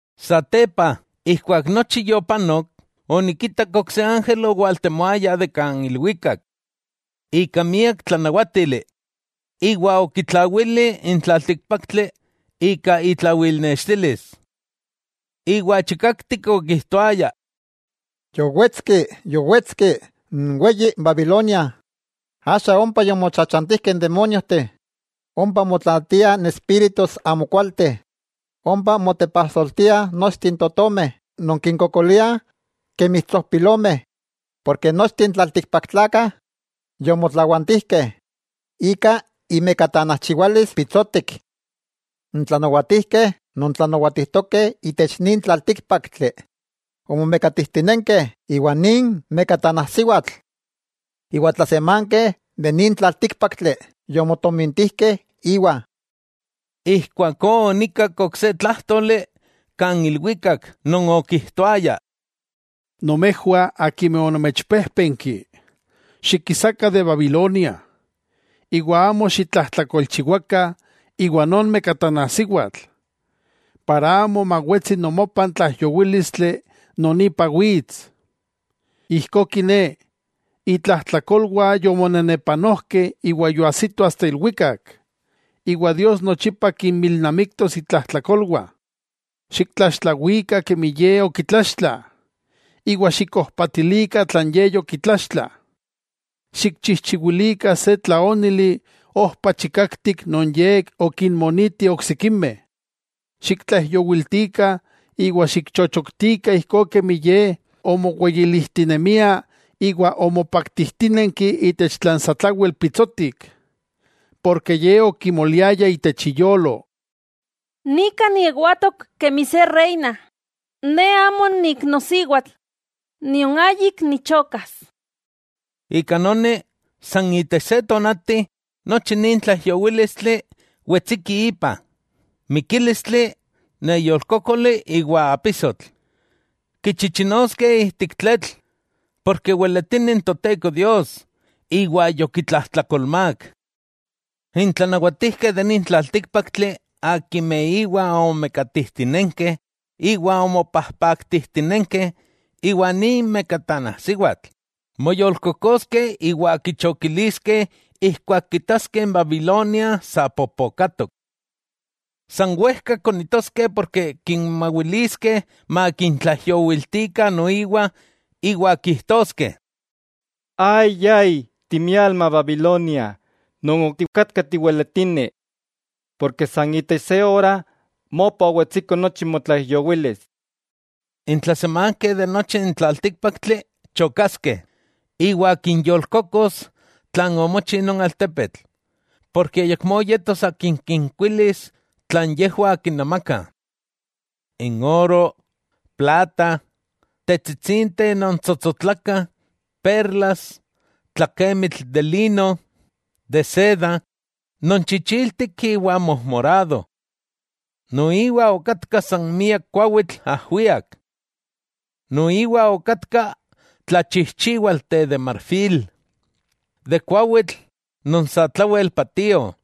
Satepa ijkuak nochi yopanok, onikitak ok se ángel owaltemoaya de ilwikak ika miak tlanawátili, iwa okitlawili n tlaltíkpaktli ika itlawilnextilis. Iwa chikaktik okijtoaya: —Yowetski, yowetski n weyi Babilonia, axa ompa yomochachantijkeh n demóniojteh, ompa motlaatiah n espíritus amokualteh, ompa motepajsoltia nochteh n totomeh non tikinkokolia kemi tsojpilomeh. Nochteh n tlaltikpaktlakah yomotlawantijkeh ika imekatanajchiwalis pitsotik. N tlanawatijkeh non tlanawatijtokeh itech nin tlaltíkpaktli omomekatijtinenkeh iwa nin mekatanajsiwatl. Iwa n tlasemankeh de nin tlaltíkpaktli yomotojtomintijkeh íwa. Ijkuakó onikak ok se tlájtoli kan ilwikak non okijtoaya: —Nomejwah akimeh onomechpejpenki, xikisakah de Babilonia, iwa amo xitlajtlakolchiwakah iwa non mekatanajsiwatl, para amo mawetsi nomopah n tlaijyowílistli non ipa wits. Ijkó kiné, itlajtlakolwah yomonenepanojkeh iwa yoajsito asta ilwikak, iwa Dios nochipa kinmilnamiktos itlajtlakolwah. Xiktlaxtlawikah kemi ye okitlaxtla, iwa xikojpatilikah tlan ye yokitlaxtla. Xikchijchiwilikah se tlaónili ojpa chikaktik non ye okinmoniti oksikimeh. Xiktlaijyowiltikah iwa xikchochoktikah ijkó kemi ye omoweyilijtinemia iwa omopaktijtinenki itech tlan satlawel pitsotik, ken ye okimoliaya itech iyolo: “Nika niewatok kemi se Reina. Ne amo niiknosiwatl, nion ayik nichokas.” Ika noni, san itech se tonati nochi nin tlaijyowílistli wetsiki ipa: mikílistli, neyolkókoli iwa apisotl. Kichichinoskeh ijtik tletl, ken weletini n Toteko Dios, iwa yokitlajtlakolmák. N tlanawatijkeh de nin tlaltíkpaktli akimeh íwa omomekatijtinenkeh iwa omopajpaktijtinenkeh iwa nin mekatanajsiwatl, moyolkokoskeh iwa kichokiliskeh ijkuak kitaskeh n Babilonia sa popokatok. San wejka konitoskeh porke kimawiliskeh makintlaijyowiltikah noiwa, iwa kijtoskeh: —¡Ay! ¡Ay! ¡Timialma Babilonia non otikatka tiweletini! Porke san itech se ora mopa owetsiko nochi motlaijyowilis. N tlasemankeh de nochi n tlaltíkpaktli chokaskeh iwa kinyolkokos tlan omochi non altepetl, ken ayakmó yetos akin kinkuilis tlan yejwah kinamakah, n oro, plata, tetsitsinteh non tsotsotlakah, perlas, tlakemitl de lino, de seda, non chichiltik iwa mojmorado. Noiwa okatka san miak kuawitl ajwiak, noiwa okatkah tlachijchiwalteh de marfil, de kuawitl non satlawel patio,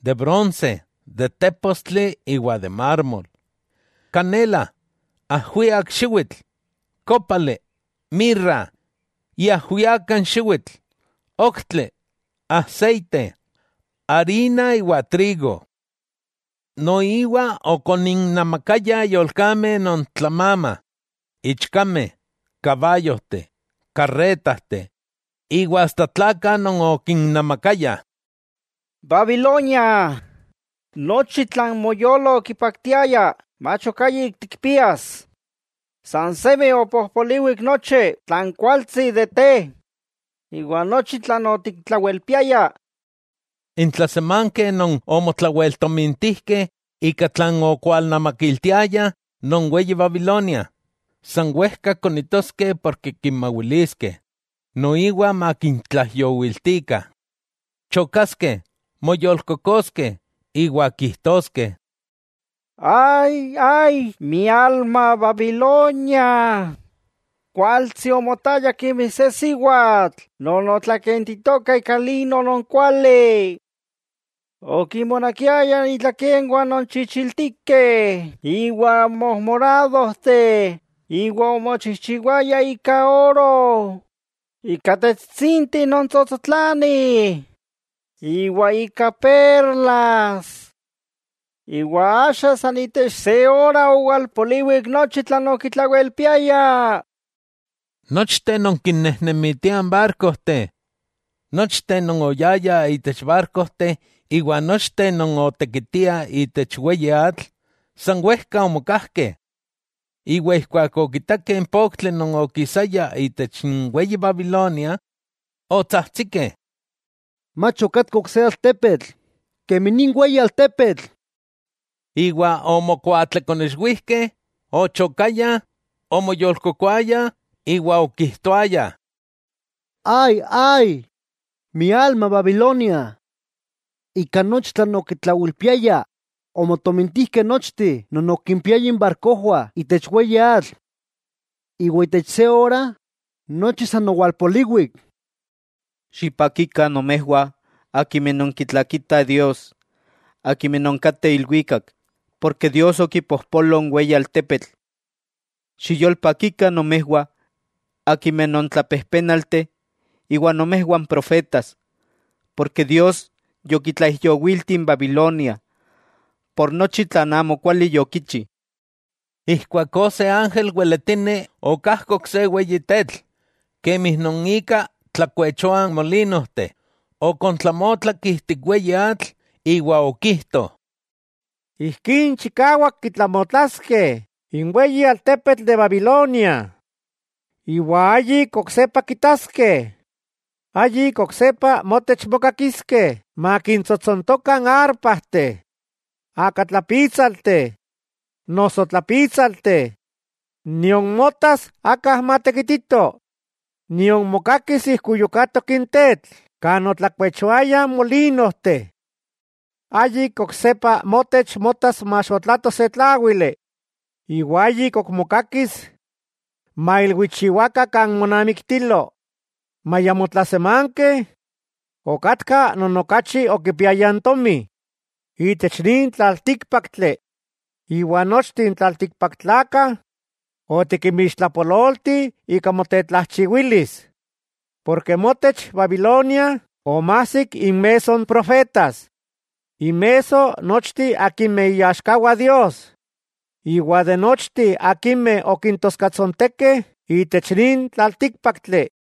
de bronse, de tépostli iwa de mármol; kanela, ajwiak xiwitl, kópali, mirra, iajwiaka n xiwitl, oktli, aseite, arina iwa trigo. Noiwa okoninnamakayah yolkameh non tlamamah, ichkameh, kabayojteh, karretajteh, iwa asta tlakah non okinnamakayah. ¡Babilonia, nochi tlan moyolo okipaktiaya mach ok ayik tikpias, san semi opojpoliwik nochi tlan kualtsi de te iwa nochi tlan otiktlawelpiaya! N tlasemankeh non omotlaweltomintijkeh ika tlan okwalnamakiltiayah non weyi Babilonia, san wejka konitoskeh ken kimawiliskeh noiwa makintlaijyowiltikah; chokaskeh, moyolkokoskeh, iwa kijtoskeh: —¡Ay! ¡Ay! ¡Mialma Babilonia! Kualtsi omotaya kemi se siwatl non otlakentitoka ika lino non kuali. ¡Okinmonakiaya itlakenwah non chichiltikeh iwa mojmoradojteh, iwa omochijchiwaya ika oro, ika tetsitsinteh non tsotsotlanih iwa ika perlas! ¡Iwa axa san itech se ora owalpoliwik nochi tlan okitlawelpiaya! Nochteh non kinnejnemitiah n barkojteh, nochteh non oyayah itech barkojteh iwa nochteh non otekitiah itech weyi atl, san wejka omokajkeh, iwa ijkuak okitakeh n poktli non okisaya itech n weyi Babilonia non otlatlatoka, otsajtsikeh: —¡Mach okatka ok se altepetl kemi nin weyi altepetl! Iwa omokuatlekonexwijkeh; ochokayah, omoyolkokoayah iwa okijtoayah: —¡Ay! ¡Ay! ¡Mialma Babilonia! Ika nochi tlan okitlawelpiaya, omotomintijkeh nochteh non okimpiayah inbarkojwah itech weyi atl; ¡iwa itech se ora nochi san owalpoliwik! Xipakikah nomejwah akimeh nonkitlakitah Dios, akimeh non kateh ilwikak, ken Dios okipojpolo n weyi altepetl. Xiyolpakikah nomejwah akimeh non tlapejpénalteh iwa nomejwah n profetas, ken Dios yokitlaijyowilti n Babilonia Ika nochi tlan amokuali yokichi. Ijkuakó se ángel weletini okajkok se weyi tetl, kemi non ika tlakuechoah n molinojteh, okontlamotlak ijtik weyi atl, iwa okijto: —¡Ijkí chikawak kitlamotlaskeh n weyi altepetl de Babilonia, iwa ayik oksepa kitaskeh! Ayik oksepa motech mokakiskeh makintsotsontokah arpajteh, akatlapítsalteh, noso tlapítsalteh, nion motas aka non matekitito, nion mokakis ijkuyukatok n tetl kan otlakuechoayah molinojteh. Ayik oksepa motech motas maxotlato se tláwili, iwa ayik ok mokakis mailwichiwakah kan monamiktilo, maya motlasemankeh okatkah non okachi okipiayah tomi ipan nin tlaltíkpaktli, iwa nochteh n tlaltikpaktlakah otikinmixtlapololti ika motetlajchiwilis. Porke motech, Babilonia, omajsik inmesso n profetas, inmesso n nochteh akimeh iaxkawah Dios, iwa de nochteh akimeh okintoskatsontekeh itech nin tlaltíkpaktli.